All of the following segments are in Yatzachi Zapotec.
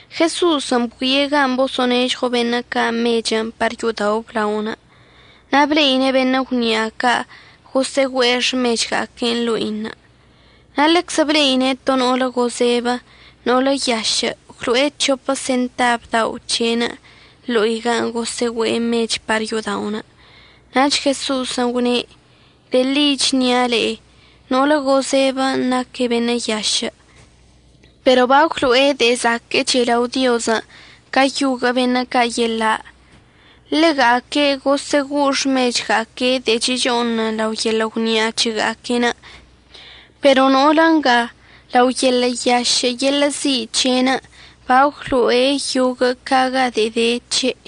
Jeso'osən' bgüie' gan' boso'onežɉo beṉə' ca' mechən' par yo'odao' əblaonə', na' ble'ine' beṉə' gwni'a ca' gosə'əgüe'e xmechga'aque' ḻo'inə'. Na' ḻeczə ble'ine' to no'olə gozebə no'olə yašə' gwlo'e c̱hopə sentab dao' c̱he'enə' ḻo'i gan' gosə'əgüe'e mechən' par yo'oda'onə'. Nach Jeso'osən' gwne': ―De'e ḻi əchnia' le'e, no'olə gozebən' naque' beṉə' yašə', pero bagwlo'e de'e zaquə'əch lao Diozən' ca yoguə' beṉə' ca' yeḻa'. Ḻega'aque' gosə'əgo'o xmechga'aque' de'e checho'onən lao yeḻə' gwni'a c̱hega'aque'enə', pero no'olə nga lao yeḻə' yašə' yeḻə' zi' c̱he'enə' bagwlo'e yoguə' ca ga de'e de c̱he'.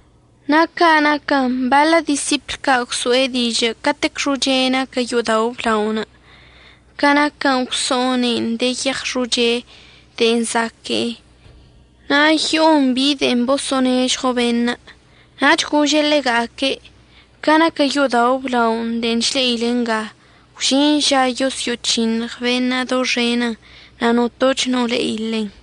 Na' ca naquə baḻə disipl ca' gwso'e dižə' catec xoche naquə yo'odao' əblaonə' ca naquə gwso'one'en de yeɉ xoche de'e zaque'e na' yo'on bi de'en boso'onežɉo beṉə'. Nach gože' ḻega'aque': ―Ca naquə yo'odao' əblaonə' de'en chle'ile nga, gwžin ža yosyo'oc̱hiṉɉ beṉə' doxenən' na' notoch no le'i ḻen.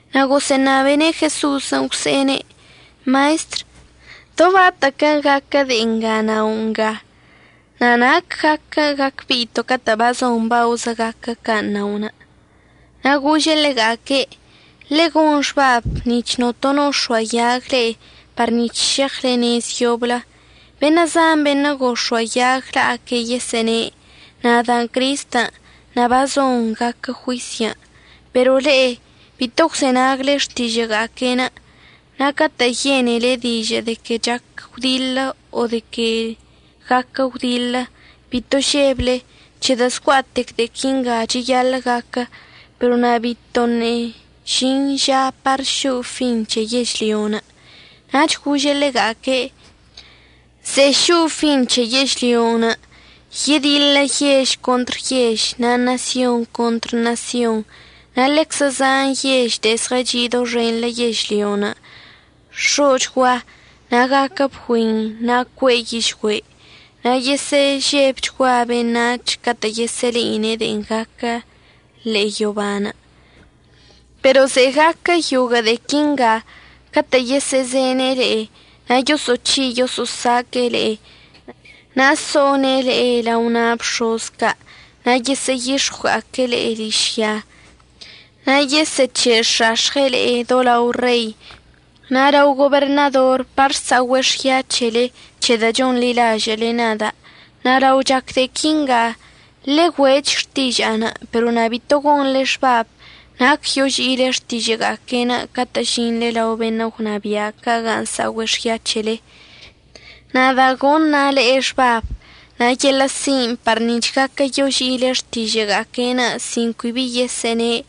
Na' gosə'əṉabene' Jeso'osən' gwse'ene': ―Maestr ¿do batə'əquə gaquə de'e nga nao' nga? na' ¿nac gaquə gacbe'ito' catə' bazon baozə gaquə can' na'onə'? Na' gože' ḻega'aque': ―Ḻe'e gon xbab nic̱h notono əx̱oayag le'e par nic̱h šeɉle nez yoblə. Beṉə' zan beṉə' gox̱oayag la'aque' yesə'əne': “Nadan' Cristən' na' bazon gaquə juisyən'.” Pero le'e bito əgwzenagle xtižə'əga'aque'enə'. Na' catə' yene'ele dižə' de que chac gwdiḻə o de que guaquə gwdiḻə, bito žeble, c̱hedə' zgua'atec de'e quinga cheyaḻə' gaquə. Pero na' bitoṉə' žin žan' par šo'o fin c̱he yežlyon'. Nach gože' ḻega'aque': ―Ze'e šo'o fin c̱he yežlyon' yediḻə yež contr yež na' ṉasyon contr ṉasyon. Na' ḻeczə zan yež de'e zɉəchi' doxenḻə yežlyon' x̱o'ochgua, na' gaquə bgüin, na' cue'e yižgüe'. Na' yesə'əžebchgua beṉac̱hən' catə' yesə'əle'ine' de'en gaquə ḻe'e yoban'. Pero ze'e gaquə yoguə' de'e quinga catə' yesə'əzene' le'e, na' yoso'oc̱hi' yoso'osaque'e le'e, na' so'one' le'e lao na' bx̱oz ca' na' yesə'əyix̱ɉwga'aque' le'e ližya. Na' yesə'əc̱he'ex̱ax̱ɉe' le'e do lao rei na' lao goberṉador par sa'ogüe' xya c̱hele c̱hedə' chonḻilažə'əle nada'. Na' lao chac de'e quinga, ḻe'e güe'ech xtiža'anə'. Pero na' bito gonḻe xbab nac yoži'ile xtižə'əga'aque'en catə' əžinḻe lao beṉə' gwnabia' ca' gan' sa'ogüe' xya c̱hele. Nada' goṉa' le'e xbab na' yeḻə' sin' par nic̱h gaquə yoži'ile xtižə'əga'aque'enə' sin cui bi yesə'əne'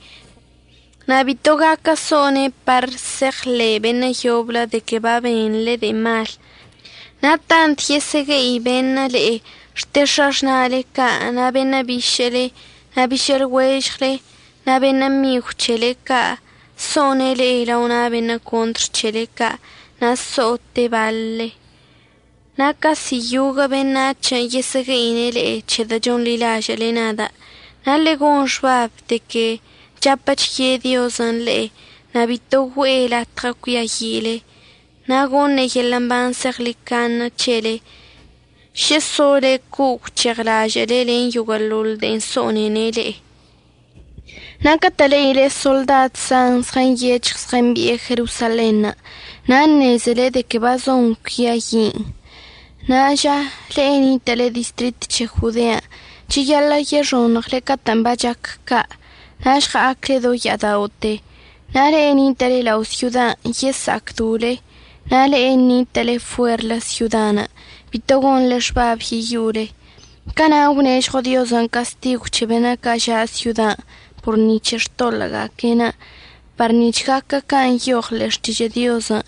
na' bito gaquə so'one' par se'eɉḻe' beṉə' yoblə de que babenḻe de'e mal. Na' tant yesə'əgue'i beṉə' le'e xte x̱axna'ale ca' na' beṉə' bišə'əle na' bišə'əlɉuežɉle na' beṉə' migw c̱hele ca' so'one' le'e lao na' beṉə' contr c̱hele ca' na' əso'ote' baḻle. Na' casi yoguə' beṉac̱hən' yesə'əgue'ine' le'e c̱hedə' chonḻilažə'əle nada'. Na' ḻe'e gon xbab de que chapə chye Diozən' le'e. Na' bito güe'e latɉə cuiayi'ile. Na' goṉe' yeḻə' mban zeɉḻicaṉe c̱helen' šə sole co'o gwc̱heɉlažə'əle len yoguə'əḻoḻ de'en so'onene' le'e. Na' catə' le'ile soḻdad zan zɉənyec̱hɉ zɉəmbi'e Jerosalenṉə', na' əṉezele de que bazon cuiayi'in. Ṉa'a ža, le'e nitə'əle distrit c̱he Jodean' cheyaḻə' yexoṉɉle catə'ən bachac ca' na' žɉa'acle do ya'ada'ote. Na' le'e nitə'əle lao' syodan' yesa'acdole, na' le'e nitə'əle fuerlə syodan' bito gonḻe xbab yeyo'ole. Cana' gwnežɉo Diozən' castigw c̱he beṉə' ca' ža' syodan' por ni c̱he xtoḻə'əga'aque'enə' par nic̱h gaquə can' nyoɉən ḻe'e Xtižə' Diozən'.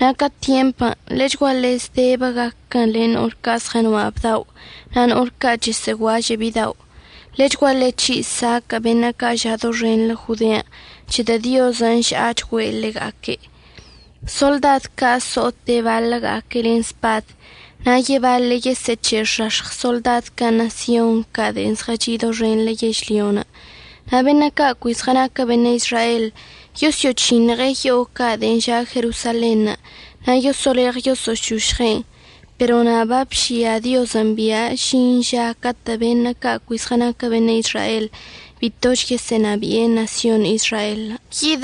Na' ca tyempən' ḻechguaḻe zdebə gaquə len no'ol ca' zɉənoa' bdao' na' no'ol ca' chəsə'əguažə' bidao'. Ḻechguaḻe c̱hi' saquə' beṉə' ca' ža' doxenḻə Jodean', c̱hedə' Diozən' əža'achgüe' ḻega'aque'. Soḻdad ca' so'ote' baḻəga'aque' len spad, na' yebaḻe' yesə'əc̱he'ex̱ax̱ɉ soḻdad ca' ṉasyon ca' de'en zɉəchi' doxenḻə yežlyon'. Na' beṉə' ca' cui zɉənaquə beṉə' Izrael yosyo'oc̱hiṉɉe' yo'o ca' de'en ža' Jerosalenṉə' na' yoso'oleɉ yosə'əšošɉe'en. Pero na' babžia Diozən' bia' əžin ža catə' beṉə' ca' cui zɉənaquə beṉə' Izrael bitoch yesə'əṉabi'e ṉasyon Izraelən'.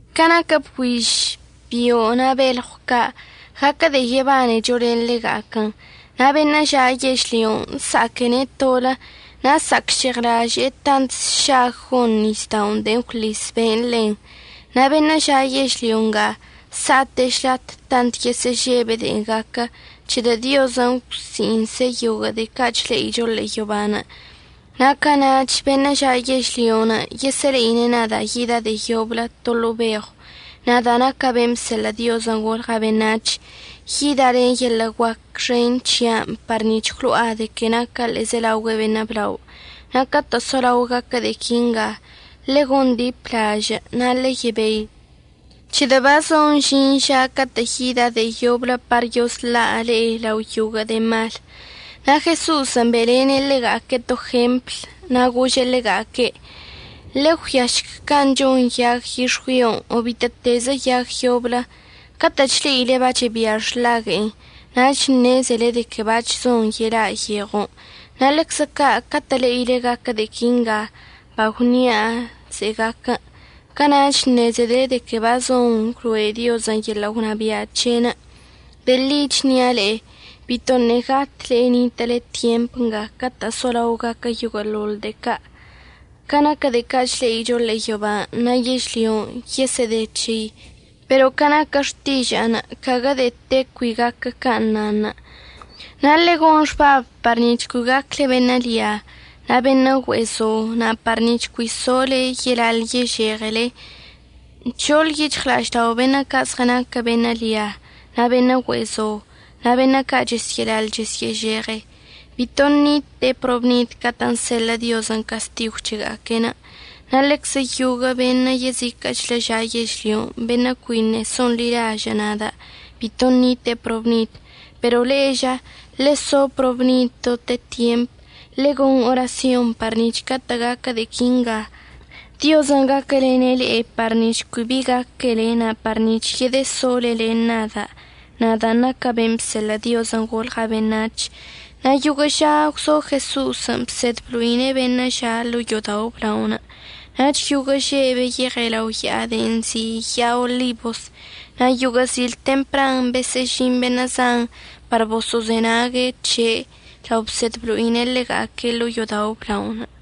Ca naquə bgüiž, bio' na' belɉw ca', gaquə de'e yebanecho len ḻega'aquən. Na' beṉə' ža' yežlyon' sa'aquene' tolə na' sa'acžeɉlaže'e tant sšag gon nisda'onə' de'en gwḻis be'enə' ḻen. Na' beṉə' ža' yežlyo nga sa'ate' šlat tant yesə'əžebe' de'en gaquə, c̱hedə' Diozən' əgwsi'iṉse' yoguə' de'e ca' chle'icho ḻe'e yoban'. Na' cana'ach beṉə' ža' yežlyon' yesə'əle'ine' nada' yida' de'e yoblə to ḻo'o beɉw, nadan' naca' ben' bseḻə' Diozən' golɉa' beṉac̱h. Yida' len yeḻə' guac xen c̱hia'anə' par nic̱h gwlo'a de que naca' ḻe'ezelaogüe beṉə' blao. Na' catə' solao gaquə de'e quinga, ḻe'e gondiplažə' na' ḻe'e yebei, c̱hedə' bazon əžin ža catə' yida' de'e yoblə par yosla' le'e lao yoguə' de'e mal. Na' Jeso'osən' be'elene' ḻega'aque' to jempl na' gože' ḻega'aque': ―Ḻe'e ggüiašc can' chon yag yix̱güion' o bitə'ətezə yag yoblə. Catə' chle'ile bachebia xḻague'e nach ṉezele de que bac̱h zon yela' yeɉon'. Na' ḻeczə ca' catə' le'ile gaquə de'e quinga bagwnia' ze'e gaquən', cana'ach əṉezele de que bazon əgwloe' Diozən' yeḻə' gwnabia' c̱he'enə'. De'e ḻi əchnia' le'e, bitoṉə' gat le'e nitə'əle tyemp nga catə' solao gaquə yoguə'əḻoḻ de'e ca'. Ca naquə de'e ca' chle'icho ḻe'e yoban' na' yežlyon' yesə'əde c̱hei, pero ca naquə xtiža'anə' caguə de'e te cui gaquə can' nanṉə'. Na' ḻe'e gon xbab par nic̱h cui gacle beṉə' lia na' beṉə' güe'e zo na' par nic̱h cui sole yelaḻ yežeɉele. Nc̱hoḻ yic̱hɉla'aždao' beṉə' ca' zɉənaque' beṉə' lia na' beṉə' güe'e zo na' beṉə' ca' chesyə'əlaḻ chesyə'əžeɉe. Bito ṉite'e probnid catə'ən seḻə' Diozən' castigw c̱hega'aque'. Na' ḻeczə yoguə' beṉə' yeziquə'əchlə ža' yežlyon' beṉə' cuiṉə' so'onḻilažə' nada' bito ṉite'e probnid. Pero le'e ža, ḻeso probnid dote tyemp, ḻe'e gon orasyon par nic̱h catə' gaquə de'e quinga Diozən' gaquəlene' le'e par nic̱h cui bi gaquele na' par nic̱h yedəsole len nada', nadan' naca' ben' bseḻə' Diozən' golɉa' beṉac̱h. Na' yoguə' ža gwzo Jeso'osən' bsed blo'ine' beṉə' ža' ḻo'o yo'odao' əblaonə'. Nach yoguə' že' beyeɉe' lao ya'a de'en nzi' ya'a Olibos. Na' yoguə' zil tempran besə'əžin beṉə' zan par boso'ozenague' c̱he' lao bsed blo'ine' ḻega'aque' ḻo'o yo'odao' əblaonə'.